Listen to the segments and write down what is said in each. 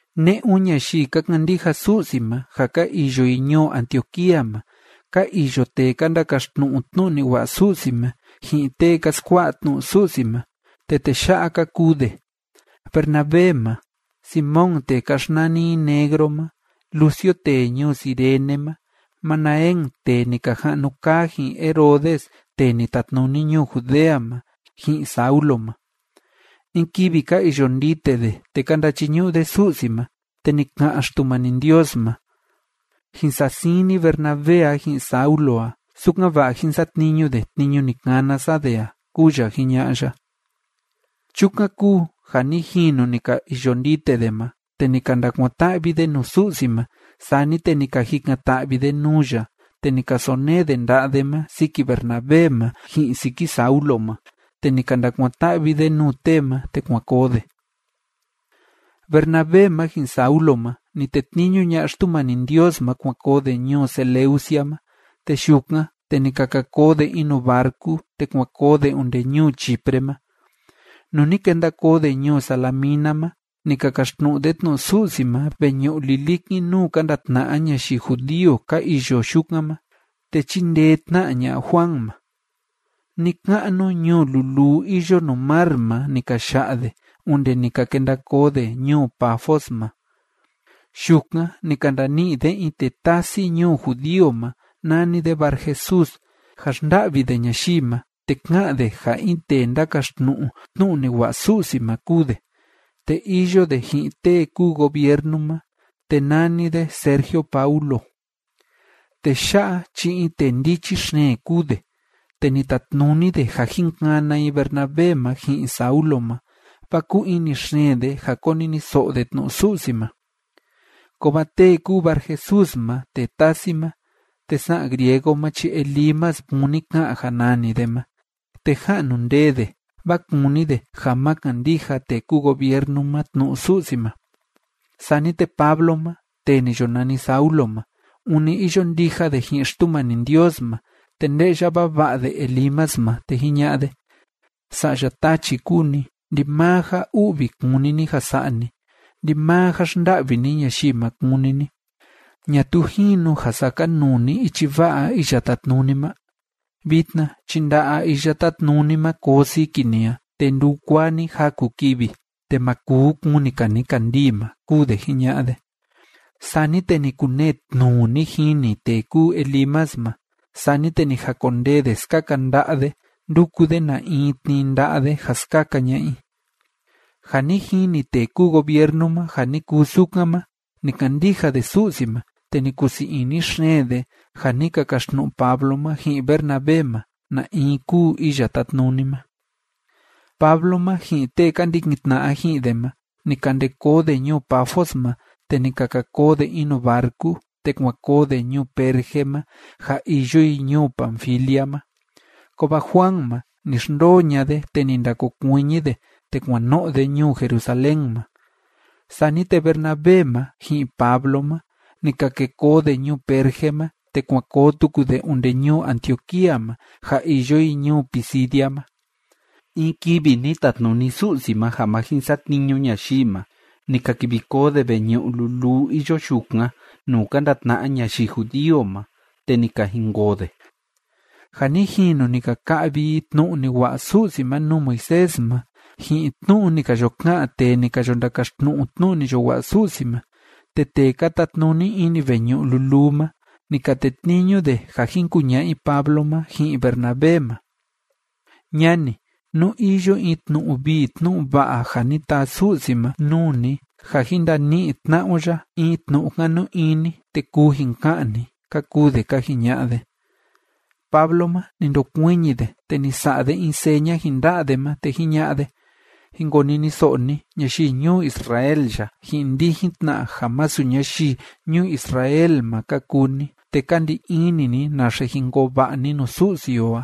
Ne'un ñayii ka kandija Su'si ma ja ka iyo i ñuu Antioquía ma ka iyo tee ka ndakaxtnu'u tnu'u ni wa'a Su'si ma, ji'in tee ka skua'a tnu'u Su'si ma, te tee ya'a ka kuu de: Bernabé ma, Simón tee ka xnani i Negro ma, Lucio tee ñuu Cirene ma, Manaén tee ni ka ja'nu kaa ji'in Herodes tee ni tatnuni ñuu Judea ma, ji'in Saulo ma. In kivi ka iyo ndite de te ka ndachiñu'u de Su'si ma, te ni ka'an Xtumani Ndios ma: ―Jin sa'a siin ni Bernabé a ji'in Saulo a, sukan‑va'a jín satniñu de tniñu ni kana sa de a ―kúu ya jiña'a ya. Chukan kúu ja ni jinu ni ka iyo ndite de ma, te ni ka ndakuan‑ta'vi de nuu Su'si ma, sani te ni ka jikan‑ta'vi de nuu ya, te ni ka sonee de nda'a de ma siki Bernabé ma ji'in siki Saulo ma, te ni ka ndakuan‑ta'vi de nuu tee ma, te kuan koo de. Bernabé ma ji'in Saulo ma, ni tetniñu ña'a Xtumani Ndios ma kuan koo de ñuu Seleucia ma, te yukan, te ni ka ka koo de in nuu barcu, te kuan koo de onde ñuu Chipre ma. Nuu ni kenda koo de ñuu Salamina ma, ni ka kaxtnu'u de tnu'u Su'si ma veñu'u lilikin nuu ka ndatna'a ñayii judío ka iyo yukan ma. Te chíndee tna ña'a Juan ma. Ni‑ka'nu ñuu luluu iyo nuu mar ma ni ka ya'a de, onde ni ka kenda koo de ñuu Pafos ma. Yukan ni ka ndani'i de in tee tasi ñuu judío ma nani de Barjesús, ja xnda'vi de ñayii ma, te ká'an de ja in tee ndákaxtnu'u tnu'u ni wa'a Su'si ma kúu de. Te iyo de ji'in tee kúu gobiernu ma, te nani de Sergio Paulo. Tee ya'a chi in tee ndichi xeen kúu de. Te ni tatnuni de ja jin kana i Bernabé ma ji'in Saulo ma, vaa kúu ini xeen de ja koniniso'o de tnu'u Su'si ma. Kovaa tee kúu Barjesús ma tee tasi ma, te sa'an griego ma chi “Elimas” kúni ka'an ja nani de ma, te ja'nu ndee de, vaa kúni de ja ma kandija tee kúu gobiernu ma tnu'u Su'si ma. Sani te Pablo ma, tee ni yo nani Saulo ma, ûni iyo ndija de ji'in Xtumani Ndios ma, te nde'ya vava'a de Elimas ma, te jiña'a de: ―Sa'ya tachi kúu ni. Ndimaa ja u'vi kúni ni ja sa'a ni. Ndimaa ja xnda'vi ni ñayii ma kúni ni. ¿Ñatuu jinu ja sakanuu ni ichi va'a Iya Tátnuni ma? Vitna chi nda'a Iya Tátnuni ma koo siki ni a, te ndukuaa ni jaku kivi, te ma kuu kuni‑ka ni kandii ma ―kúu de jiña'a de. Sani te ni kunee tnuu ni jini tee kúu Elimas ma. Sani te ni jakondee de skaka nda'a de ndúku de na in tnii nda'a de ja skaka ña'a i. Ja ni jini tee kúu gobiernu ma ja ni kuu sukan ma, ni kandija de Su'si ma, te ni kusii ini xeen de ja ni ka kaxtnu'u Pablo ma ji'in Bernabé ma na in kúu Iya Tátnuni ma. Pablo ma ji'in tee ka ndikin tna'a ji'in de ma, ni ka nde koo de ñuu Pafos ma, te ni ka ka koo de in nuu barcu, te kuan koo de ñuu Perge ma ja iyo i ñuu Panfilia ma. Kovaa Juan ma, ni xndoo ña'a de, te ni ndakokuiñi de, te kuan no'o de ñuu Jerusalén ma. Sani te Bernabé ma ji'in Pablo ma, ni ka ke koo de ñuu Perge ma, te kuan koo tuku de onde ñuu Antioquía ma ja iyo i ñuu Pisidia ma. In kivi ni tatnuni Su'si ma ja ma jin satniñu ñayii ma, ni ka kivi koo de veñu'u luluu iyo yukan nuu ka ndatna'a ñayii judío ma, te ni ka jinkoo de. Ja ni jinu ni ka ka'vi i tnu'u ni wa'a Su'si ma nuu Moisés ma, ji'in tnu'u ni ka yo ka'an tee ni ka yo ndakaxtnu'u tnu'u ni yo wa'a Su'si ma, te tee ka tatnuni ini veñu'u luluu ma, ni ka tetniñu de ja jin kuña'a i Pablo ma ji'in Bernabé ma: ―Ñani, nú iyo in tnu'u vii tnu'u va'a ja ni taa Su'si ma nuu ni ja jin ndani'i tna'a o ya in tnu'u kanu ini, te kuu jin ka'an ni ―ka kuu de ka jiña'a de. Pablo ma, ni ndokuiñi de, te ni sa'a de in seña ji'in nda'a de ma, te jiña'a de: ―Jin koniniso'o ni, ñayii ñuu Israel ya, ji'in ndijin tna ja masu ñayii ñuu Israel ma ka kuu ni te ka ndi ini ni naxe jin koo va'a ni nuu Su'si o a,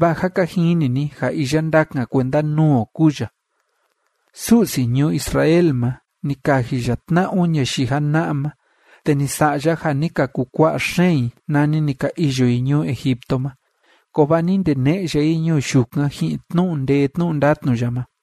vaa jâ ka jini ni ja iya ndakan kuenda nuu o kúu ya. Su'si ñuu Israel ma, ni kaji ya tna'a o ñayii jana'a ma, te ni sa'a ya ja ni ka kukua'a xeen i, nani ni ka iyo i ñuu Egipto ma. Kovaa ni ndene'e ya i ñuu yukan ji'in tnu'u ndee tnu'u ndatnu ya ma.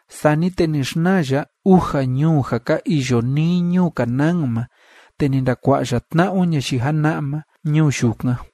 Sani te ni xnaa ya uja ñuu ja ka iyo nii ñuu Canaán ma, te ni ndakua'a ya tna'a o ñayii jana'a ma ñuu yukan.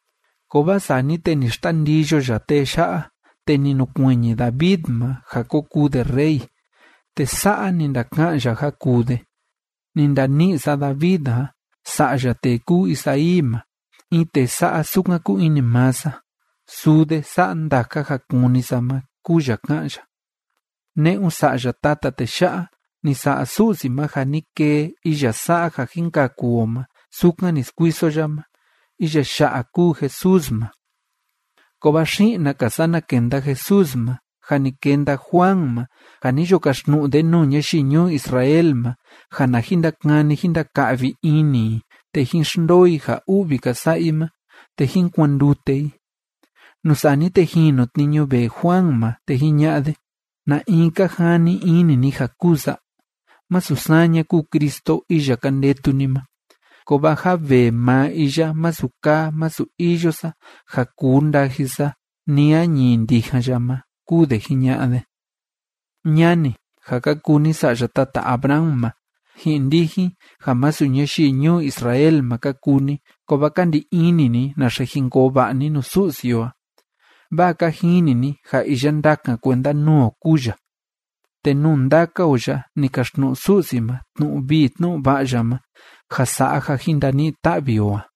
Kovaa sani te ni xtandiyo ya tee ya'a, te ni nukuiñi David ma ja ko kuu de rey. Te sa'a ni ndaka'an ya ja kuu de: “Ni ndani'i sa David a sa'ya tee kúu Isaí ma, in tee sa'a sukan kúu ini maa sa. Suu de sa'a ndaka ja kúni sa ma”, kúu ya ká'an ya. ’Ne'un sa'ya tata tee ya'a, ni sa'a Su'si ma ja ni kee iya sa'a ja jin kaku o ma, sukan ni skuiso ya ma. Iya ya'a kúu Jesús ma, kovaa xi'na‑ka sana kenda Jesús ma, jâ ni kenda Juan ma ja ni yo kaxtnu'u de nuu ñayii ñuu Israel ma ja na jin ndakani jín ndaka'vi ini i te jín xndoo i ja u'vi ka sa'a i ma te jín kuandute i. Nuu sani te jinu tniñu vee Juan ma, te jiña'a de: “¿Na in ka jani ini ni ja kúu sa? Masu saña kúu Cristo, iya ka ndetu ni ma. Kovaa jâ vee maa iya masu kaa masu iyo sa ja kuu ndaji sa ni a ñií ndijan ya ma”, kúu de jiña'a de. ’Ñani, ja ka kuu ni sa'ya tata Abraham ma, ji'in ndijin ja masu ñayii ñuu Israel ma ka kuu ni kovaa ka ndi ini ni naxe jin koo va'a ni nuu Su'si o a, vaa ka jini ni ja iya ndakan kuenda nuu o kúu ya, te nuu ndaka o ya ni kaxtnu'u Su'si ma tnu'u vii tnu'u va'a ya ma ja sa'a ja jin ndani'i ta'vi o a.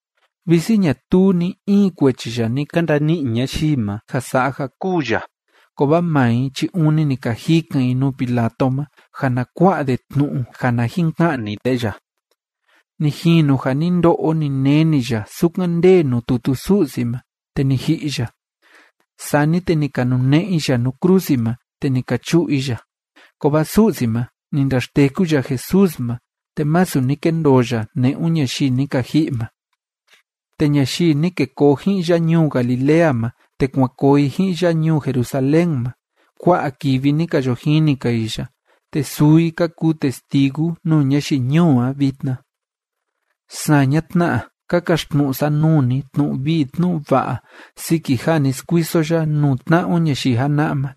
Visi ñatuu ni‑in kuechi ya ni ka ndani'i ñayii ma ja sa'a ja kûu ya, kovaa maa i chi ûni ni ka jikan i nuu Pilato ma ja na kua'a de tnu'u ja na jin ka'ni de ya. Ni jinu ja ni ndo'o ni neni ya sukan ndee nuu tutu Su'si ma, te ni ji'i ya. Sani te ni ka nune'e i ya nuu krusi ma, te ni ka chu'u i ya. Kovaa Su'si ma, ni ndaxteku ya Jesús ma, te masu ni kendoo ya ne'un ñayii ni ka ji'i ma. Te ñayii ni ke koo ji'in ya ñuu Galilea ma te kuan koo i ji'in ya ñuu Jerusalén ma, kua'a kivi ni ka yo jini‑ka i ya, te suu i ka kuu testigu nuu ñayii ñuu a vitna. ’Saña tna, ka kaxtnu'u sa nuu ni tnu'u vii tnu'u va'a siki ja ni skuiso ya nuu tna'a o ñayii jana'a ma.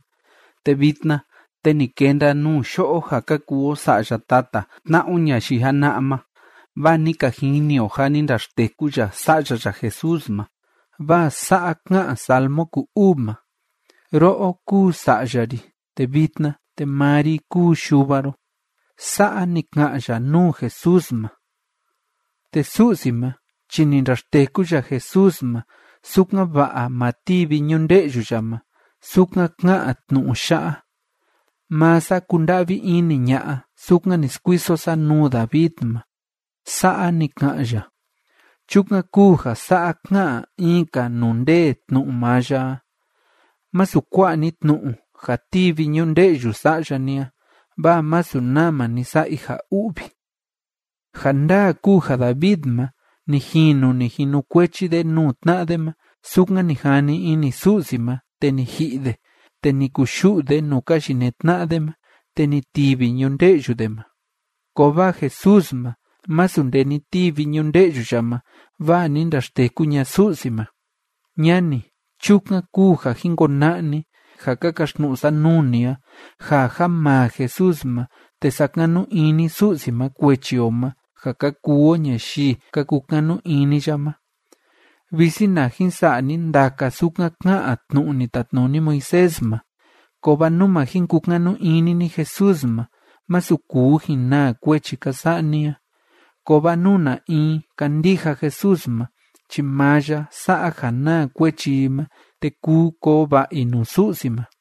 Te vitna te ni kenda nuu yo'o ja ka kuu o sa'ya tata tna'a o ñayii jana'a ma vaa ni ka jini o ja ni ndaxteku ya Sa'ya ya Jesús ma, vaa sa'a ká'an Salmo ku‑uu ma: “Ro'o kúu Sa'ya ri, te vitna te maa ri kúu Yuva ro.” Sa'a ni ka'an ya nuu Jesús ma. Te Su'si ma chi ni ndaxteku ya Jesús ma, sukan‑va'a ma tivi ñunde'yu ya ma, sukan ká'an tnu'u ya'a: “Maa sa kunda'vi ini ña'a, sukan ni skuiso sa nuu David ma.” Sa'a ni ka'an ya. Chukan kúu ja sa'a ká'an in‑ka nuu ndee tnu'u maa ya a: “Masu kua'a ni tnu'u ja tivi ñunde'yu sa'ya ni a, vaa masu nama ni sa'a i ja u'vi.” Ja ndaa kúu ja David ma, ni jinu ni jinukuechi de nuu tna'a de ma, sukan ni jani ini Su'si ma, te ni ji'i de, te ni kuyu'u de nuu ka yinee tna'a de ma, te ni tivi ñunde'yu de ma. Kovaa Jesús ma, masu nde ni tivi ñunde'yu ya ma, vaa ni ndaxteku ña'a Su'si ma. ’Ñani. Chukan kúu ja jin kona'a ni ja ka kaxtnu'u sa nuu ni a ja ja maa Jesús ma, te sakanu ini Su'si ma kuechi o ma ja ka kuu o ñayii ka kukanu ini ya ma. Visi na jin sa'a ni ndaka sukan ká'an tnu'u ni tatnuni Moisés ma, kovaa nú ma jin kukanu ini ni Jesús ma, masu kuu jin naa kuechi ka sa'a ni a. Kovaa nú na in kandija Jesús ma chi maa ya sa'a ja naa kuechi i ma te kuu koo va'a i nuu Su'si ma.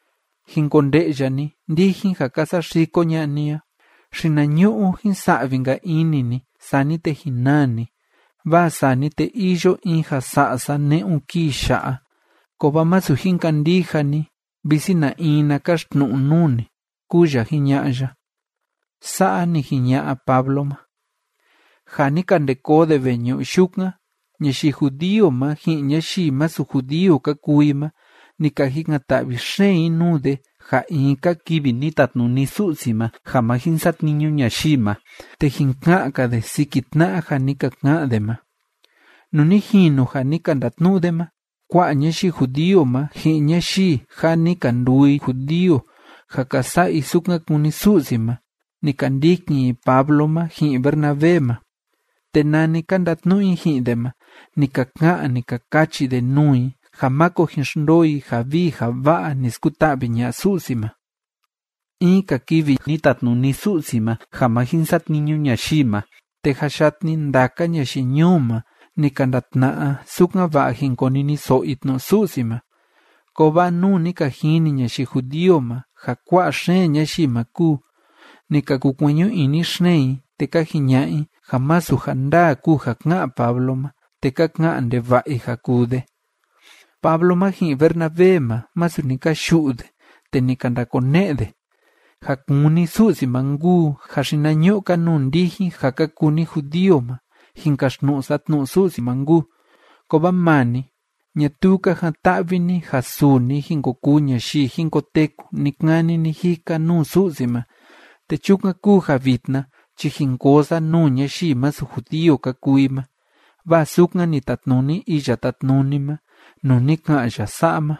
Jin konde'ya ni, ndijin ja ka saxiko ña'a ni a. Xinañu'u jin sa'vi‑nka ini ni, sani te jin naa ni. Vaa sani te iyo in ja sa'a sa ne'un kii ya'a. Kovaa masu jin kandija ni, visi na in na kaxtnu'u nuu ni, kúu ya jiña'a ya. ―Sa'a ni jiña'a Pablo ma. Ja ni ka nde koo de veñu'u yukan, ñayii judío ma ji'in ñayii masu judío ka kuu i ma, ni ka jikan‑ta'vi xeen i nuu de ja in‑ka kivi ni tatnuni Su'si ma ja ma jin satniñu ñayii ma, te jin ka'an‑ka de siki tna'a ja ni ka ka'an de ma. Nuu ni jinu ja ni ka ndatnu'u de ma, kua'a ñayii judío ma, ji'in ñayii ja ni ka nduu i judío ja ka sa'a i sukan kúni Su'si ma, ni ka ndikin i Pablo ma ji'in Bernabé ma. Te nani ka ndatnu'u i ji'in de ma, ni ka ka'an, ni ka kachi de nuu i ja máko jin xndoo i ja vii ja va'a ni skuta'vi ña'a Su'si ma. In‑ka kivi ni tatnuni Su'si ma ja ma jin satniñu ñayii ma, te jâ yatni ndaka ñayii ñuu ma ni ka ndatna'a, sukan‑va'a jin koniniso'o i tnu'u Su'si ma. Kovaa nuu ni ka jini ñayii judío ma ja kua'a xeen ñayii ma kúu, ni ka kukueñu ini xeen i, te ka jiña'a i ja masu ja ndaa kúu ja ká'an Pablo ma, te ka ka'an ndeva'a i ja kuu de. Pablo ma ji'in Bernabé ma, masu ni ka yu'u de, te ni ka ndakone'e de: ―Ja kúni Su'si ma nkuu ja xinañu'u‑ka nuu ndijin ja ka kuu ni judío ma jin kaxtnu'u sa tnu'u Su'si ma nkuu. Kovaa maa ni, ñatuu ka jan‑ta'vi ni ja suu ni jin ko kuu ñayii jin koteku ni‑kani ni‑jika nuu Su'si ma. Te chukan kúu ja vitna chi jin koo sa nuu ñayii masu judío ka kuu i ma, vaa sukan ni tatnuni Iya Tátnuni ma nuu ni ka'an ya sa'a ma: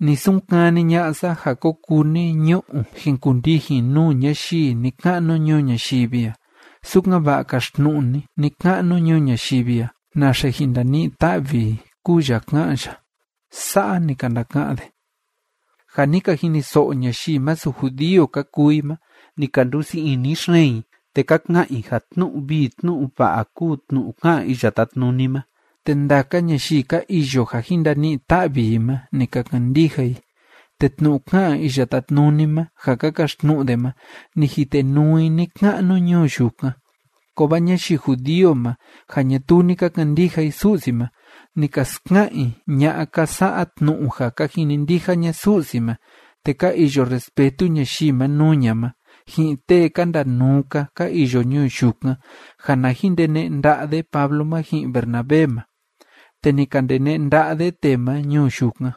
Ni sunkani ña'a sa ja ko kuu ni ñu'u jin kundijin nuu ñayii ni‑ka'nu ñuu ñayivi a, sukan‑va'a kaxtnu'u ni ni‑ka'nu ñuu ñayivi a naxe jin ndani'i ta'vi i, kúu ya ká'an ya. ―Sa'a ni ka ndaka'an de. Ja ni ka jiniso'o ñayii masu judío ka kuu i ma, ni ka nduu sii ini xeen i te ka ka'an i ja tnu'u vii tnu'u va'a kúu tnu'u ká'an Iya Tátnuni ma, te ndaka ñayii ka iyo ja jin ndani'i ta'vi i ma, ni ka kandija i. Te tnu'u ká'an Iya Tátnuni ma ja ka kaxtnu'u de ma, ni jitenuu i ni‑ka'nu ñuu yukan. Kovaa ñayii judío ma ja ñatuu ni ka kandija i Su'si ma, ni ka ska'an i ña'a ka sa'a tnu'u ja ka jinindija ña Su'si ma te ka iyo respetu ñayii ma nuu ña ma, ji'in tee ka ndanuu‑ka ka iyo ñuu yukan, ja na jin ndene'e nda'a de Pablo ma ji'in Bernabé ma. Te ni ka ndene'e nda'a de tee ma ñuu yukan.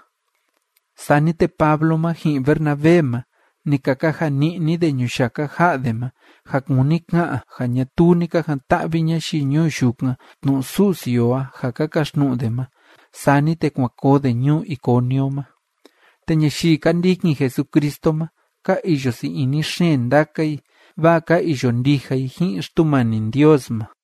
Sani te Pablo ma ji'in Bernabé ma, ni ka kaja ni'ni de ñuyaka ja'a de ma, ja kúni ka'an ja ñatuu ni ka jan‑ta'vi ñayii ñuu yukan tnu'u Su'si o a ja ka kaxtnu'u de ma. Sani te kuan koo de ñuu Iconio ma. Te ñayii ka ndikin Jesucristo ma, ka iyo sii ini xeen ndaka i, vaa ka iyo ndija i ji'in Xtumani Ndios ma.